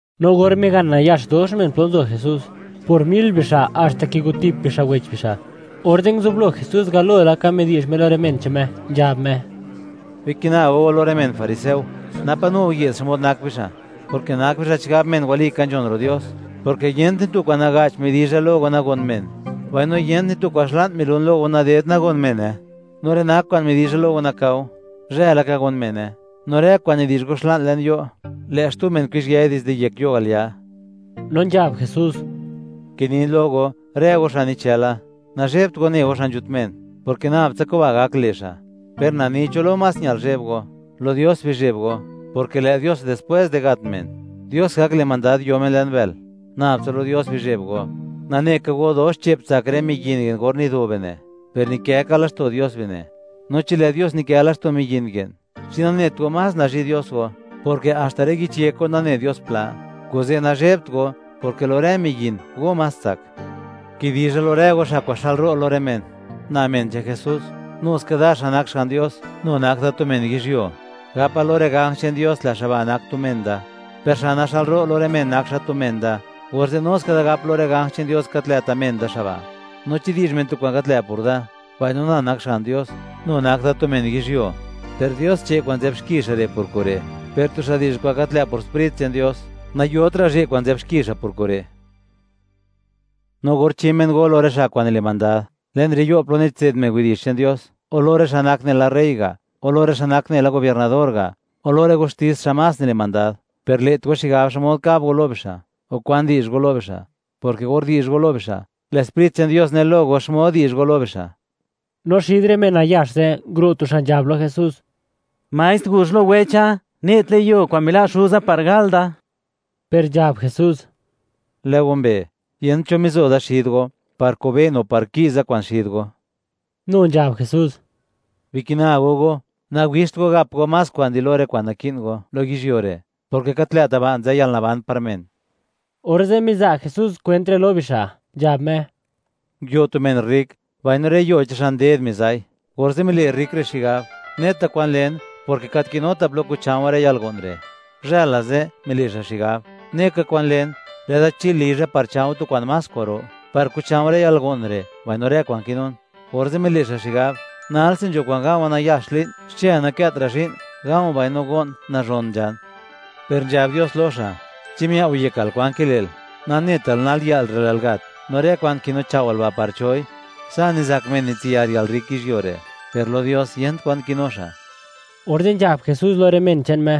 No or migan nayax dox men, plo nzo Jesús, por mil bixa', haxta kigotip bixa' wech bixa', orze' nguzublo Jesús galo laka midi'zh Me lo rë men che'n Me, nzhab Me: ―Bikina go go lo rë men fariseo, napa' nu go ye'd xmod nak bixa'; porke nak bixa' chigab men walika nzhon ro' Dios, porke yent ni tu kwa'n naga'ch midizha lo go nagon men; mbaino yent ni tu kwa'n xla'n milun lo go naded nagon mene. No rë nak kwa'n nidi'zh go lo nakao, zhë laka gon mene; no rë kwa'n nidi'zh go xla'n le'n yo', lë' xtu men kuzhyëi dizde yek yo' al ya. No nzhab Jesús: ―Kinin lo go, rë go xa' nichëla; nazhebt go ne go xa' nzhut men, porke nab tsa kuba' gak le' xa'. Per na ni cho lo más ñal zheb go: Lo Dios bizheb go, porke lë' Dios, dispwés di gat men, Dios gak le' mandad, yo men le'n bël. Nab tsa lo Dios bizheb go. ’Nane ka go, dox che'p tsak rë miyin ye'n or nido bine', per nikë ka laxto' Dios bine'. No chi lë' Dios nikë laxto' miyin ye'n, ¿chi nanet go, más nazhi' Dios go?, porke haxta rë yich yek go nane Dios pla. Kuze' nazhebt go, porke lo rë miyin, go más tsak. ’Kidizha lo rë go, xa' kwa'n xë'lro' lo rë men: “Na men che'n Jesús”, nu ska da, xa' nak Xga'n Dios nu nak da tu men yizhyuo, gapa lo rë ganj che'n Dios: “Lë' xa' ba' nak tu men da”, per xa' naxë'lro' lo rë men, nak xa' tu men da, orze', nu ska da gap lo rë ganj che'n Dios: “Gat lë'ta' men da xa' ba'.” ’No chi di'zh men tu kwa'n gat lë' por da, mbaino na nak Xga'n Dios nu nak da tu men yizhyuo, per Dios che' kwa'n nzë'b xki xa' re' por kure'; per tu xa' di'zh kwa'n gat lë' por Sprit che'n Dios, nayotra' zhe' kwa'n nzë'b xki xa' por kure'. ’No or chi men go lo rë xa' kwa'n nile' mandad le'n rë yo' plo nitse'd men widi'zh che'n Dios, o lo rë xa' nak nela rey ga', o lo rë xa' nak nela gobiernador ga', o lo rë gustis xa' más nile' mandad; per le't go xigab xmod kab go lo bixa', o kwan di'zh go lo bixa', porke or di'zh go lo bixa', lë' Sprit che'n Dios ne lo go xmod di'zh go lo bixa'. No xid rë men nayax ze', nguro' tu xa' nzhab lo Jesús: ―Maestr, guzh lo wecha, ne' tlë' yuo kwa'n mila' xuza par gal da. Per nzhab Jesús: ―Lë' you, yent cho mizo da xid go, par kobe'n o par ki'za kwa'n xid go. Nu nzhab Jesús: ―Bikina go go, nawixt go gap go más kwa'n di lo rë kwa'n naki'n go, lo yizhyuo re', porke gat lë'ta' ba' nzë yalnaban par men. Orze' miza' Jesús kwent re' lo bixa', nzhab Me: ―Nguio tu men rrik, mbaino rë yuo che'n xa' nded miza'i, orze' mile' xa' rrik re' xigab: “¡Neta kwan len, porke gat kinuta' plo kucha̱u̱ rë yalgo'n re'!” Guzhë la ze' mile' xa' xigab: “¡Neka kwan len! Lë'da chil lizha par cha̱u̱ tu kwa'n más kwa'ro, par kucha̱u̱ rë yalgo'n re', mbaino rë kwa'n kinun.” Orze' mile' xa' xigab: “Nalse nzho kwa'n ga̱u̱wa̱ nayax li'n; xchë nakëtra' zhi'n; ga̱u̱ mbaino go'n, nazhon nzhan.” Per nzhab Dios lo xa': “¿Chi miao' yekal kwan kile'l? Nanetal, nal yë'l re', lë'l gat, no rë kwa'n kinuchao'wal ba', ¿par choi?” Sa' nizak men nitsiyar yalrrik yizhyuo re', per lo Dios, yent kwan kinu xa'. Orze' nzhab Jesús lo rë men che'n Me: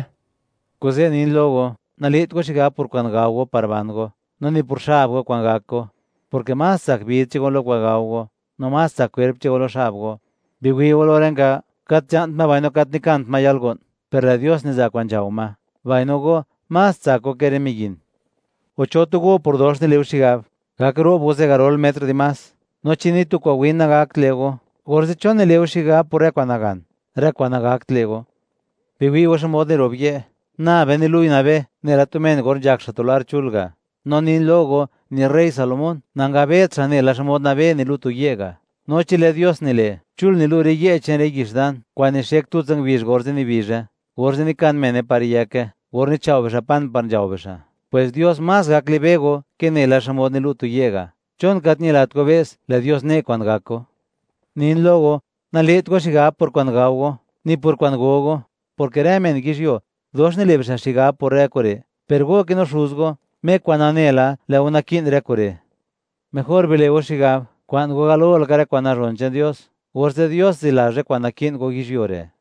―Kuze' nin lo go, le't go xigab por kwa'n gao go par ban go, no ni por xab go kwa'n gak go, porke más tsak bid che'n go lo kwa'n gao go; no más tsak kwerp che'n go lo xab go. Biwi' go lo rë nga, gat nzha'nt ma mbaino gat nikant ma yalgo'n, per lë' Dios niza' kwa'n nzhao ma; mbaino go, ¡más tsak go ke rë miyin! O, ¿cho tu go por dox nile' go xigab, gak ro'b go zigarol metr dimás? No chi ni tu kwa'n win nagakt le' go, orze', ¿chon nile' go xigab por rë kwa'n nagan, rë kwa'n nagakt le' go? ’Biwi' go xmod niro'b ye', nabe nilu'i nabé, nela tu men or nzhak xa' tu lar chul ga'; no nin lo go, ni rey Salomón, nangabet xa' nela xmod nabé nilu' tu ye' ga'. No chi lë' Dios nile', chul nilu' rë ye' che'n rë yix dan, kwa'n nixek tutsa ngubizh, orze' nibizhe, orze' nikan mene par yëke, or nichao' bixa' pan par nzhao bixa', pwes Dios más gak libe' go ke nela xmod nilu' tu ye' ga'. ¿Chon gat ñilat go be's, lë' Dios ne' kwa'n gak go? Nin lo go, nale't go xigab por kwa'n gao go, no ni por kwa'n go go, porke rë men yizhyuo, dox nile' bixa' xigab por rë kure'; per go kinu Xuz go, Me kwa'n nane la, lë' go naki'n rë kure'. Mejor bile' go xigab, kwa'n go, galo laka rë kwa'n nazhon che'n Dios, orze' Dios zilazh rë kwa'n naki'n go yizhyuo re'.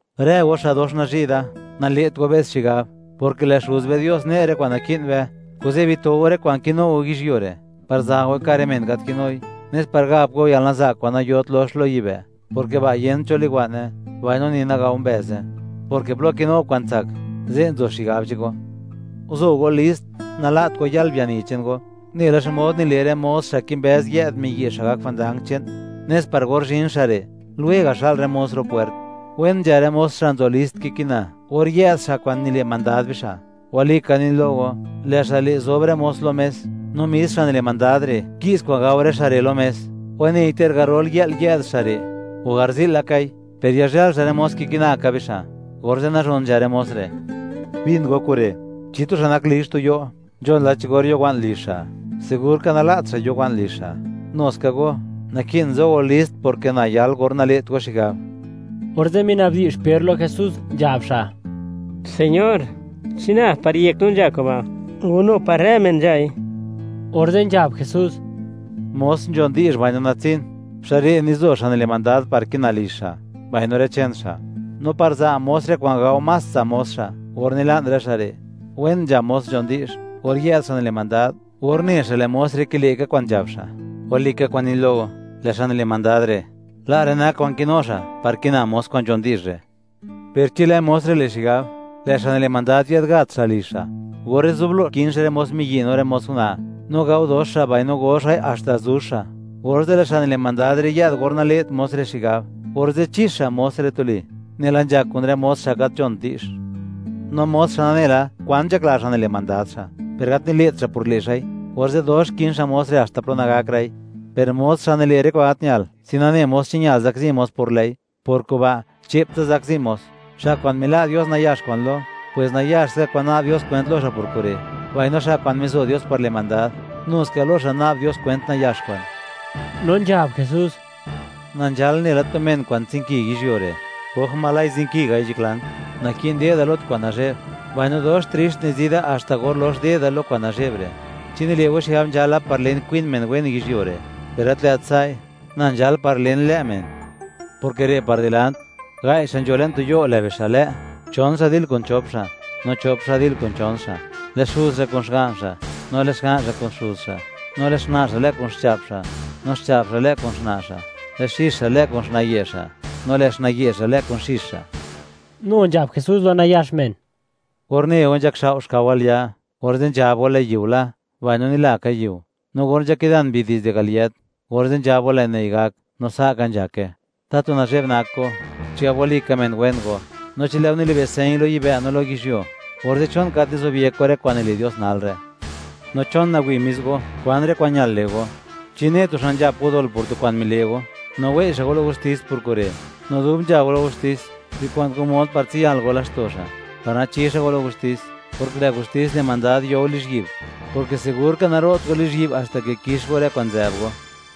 ’Rë go, xa' dox nazhi' da, nale't go be's xigab, porke lë' Xuz be Dios ne' rë kwa'n naki'n be. Kuze' bito go rë kwa'n kinu go yizhyuo re', par za' goi ka' rë men gat kinui, nes par gap go yalnaza'k kwa'n nayot lox lo yibë', porke ba', yent cho liwa'ne, mbaino ni nagao mbëze, porke plo kinu go kwa'n tsak, ze' nzo xigab chego. ’Guzo go list, nala't go yal biani che'n go, nela xmod nile' rë mos, xa' kimbëz yë'd miyi' xa' gak jwandang che'n, nes par or zhin xa' re', lwega' xa'l rë mos ro' pwert. Wen nzha rë mos xa' nzo list kikina, or yë'd xa' kwa'n nile' mandad bixa'. Walika nin lo go, lë' xa' le' zob rë mos lo mes, no mis xa' nile' mandad re', ki'z kwa'n gao rë xa' re' lo mes. Wanei, ter garol yë'l yë'd xa' re', o garzi'l lakai, per yazhël xa' rë mos kikina ka bixa', orze' nazhon nzha rë mos re'. Bin go kure': Chi tu xa' nak lizh tu yo', nzhon la cho or yo wa'n lizh xa', sigurka nala't xa' yo wa'n lizh xa'. Nuska go, naki'n zo go list; porke na yal, or nale't go xigab. Orze' minabdi'zh Per lo Jesús, nzhab xa': ―Señor, ¿chi nab par yek no nzha kuba', o nu par rë men nzhai? Orze' nzhab Jesús: ―Mos nzhon di'zh mbaino natsin, xa' re' nizo xa' nile' mandad par kina lizh xa', mbaino rë che'n xa', no par za' mos re', kwa'n gao más tsa' mos xa', or nila'n rë xa' re'. Wen nzha mos nzhon di'zh, or yë'd xa' nile' mandad, or ne xa' lë' mos re' kile' ka kwa'n nzhab xa'. Walika kwa'n nin lo go, lë' xa' nile' mandad re', la' rë nak kwa'n kinu xa', par kina mos kwa'n nzhon di'zh re'. Per chi lë' mos re' le' xigab: “Lë' xa' nile' mandad yë'd gaat xa' lizh xa'”, orze' zublo kin xa' rë mos miyi' no rë mos una', no gao dox xa' mbaino go xa'i haxta zuzh xa', orze' lë' xa' nile' mandad re', yë'd or nale't mos re' xigab, orze' chix xa' mos re' tuli, nela nzhak kun rë mos xa' gat nzhon di'zh. ’No mos xa' nane la, kwan nzhakla xa' nile' mandad xa', per gat nile't xa' por le' xa'i, orze' dox kin xa' mos re', haxta plo nagakra'i; per mos xa' nile' rë kwa'n gat ñal, sin nane mos, chi ñal zakzi mos por lë'i, por kuba' che'ptsa zakzi mos. Xa' kwa'n mila' Dios nayax kwa'n lo, pwes nayax ska kwa'n na'b Dios kwent lo xa' por kure'; mbaino xa' kwa'n mizo Dios par le' mandad, nu ska lo xa' na'b Dios kwent nayax kwa'n. No nzhab Jesús: ―Na nzhal nela tu men kwa'n tsinki yizhyuo re'; ¡oj zinkigai nzhaklan! Naki'n de'da lo tu kwa'n nazhe'b, mbaino dox trixt nizi da, haxta or lox de'da lo kwa'n nazhe'b re'. ¿Chi nile' go xigab nzhala par len, kwin men wen yizhyuo re'? Per gat lë't sa'i; na nzhal par len lë' men, porke re' par dilant, gai' xa' nzho le'n tu yo', lë' bixa' lë'; chon xa' dil kun chop xa', no chop xa' dil kun chon xa'. Lë' xuz xa' kun xga'n xa', no lë' xga'n xa' kun xuz xa'; no lë' xna' xa' lë' kun xcha'p xa', no xcha'p xa' lë' kun xna' xa'; lë' xix xa' lë' kun xna'ye' xa', no lë' xnaye' xa' lë' kun xix xa'. Nu nzhab Jesús lo nayax men: ―Or ne go nzhakxao' xkao al ya, orze' nzhab go: “Lë' yiu la”, mbaino nila ka yiu; no or nzhakidan mbi dizde al yët, orze' nzhab go: “Lë' nëi' gak”, no sa' ka nzhake. ¡Tatu nazhe'b nak go, chigab walika men wen go! No chi lë' go nilibe' señ lo yibë' no lo yizhyuo; orze', ¿chon gat nizobyek go rë kwa'n nile' Dios nal re'? ’No, ¿chon nawi' mis go, kwan rë kwa'n ñal le' go? Chi ne tu xa' nzhap go dol por tu kwa'n mile' go, no wei' xa' go lo gustis por kure', no dub nzha go lo gustis, bikwa'n go mod par tsiyal go laxto' xa', par nachi xa' go lo gustis, porke lë' gustis le' mandad yo go lizhyi'b; porke sigur ka, naro't go lizhyi'b haxta ke kix go rë kwa'n nzë'b go.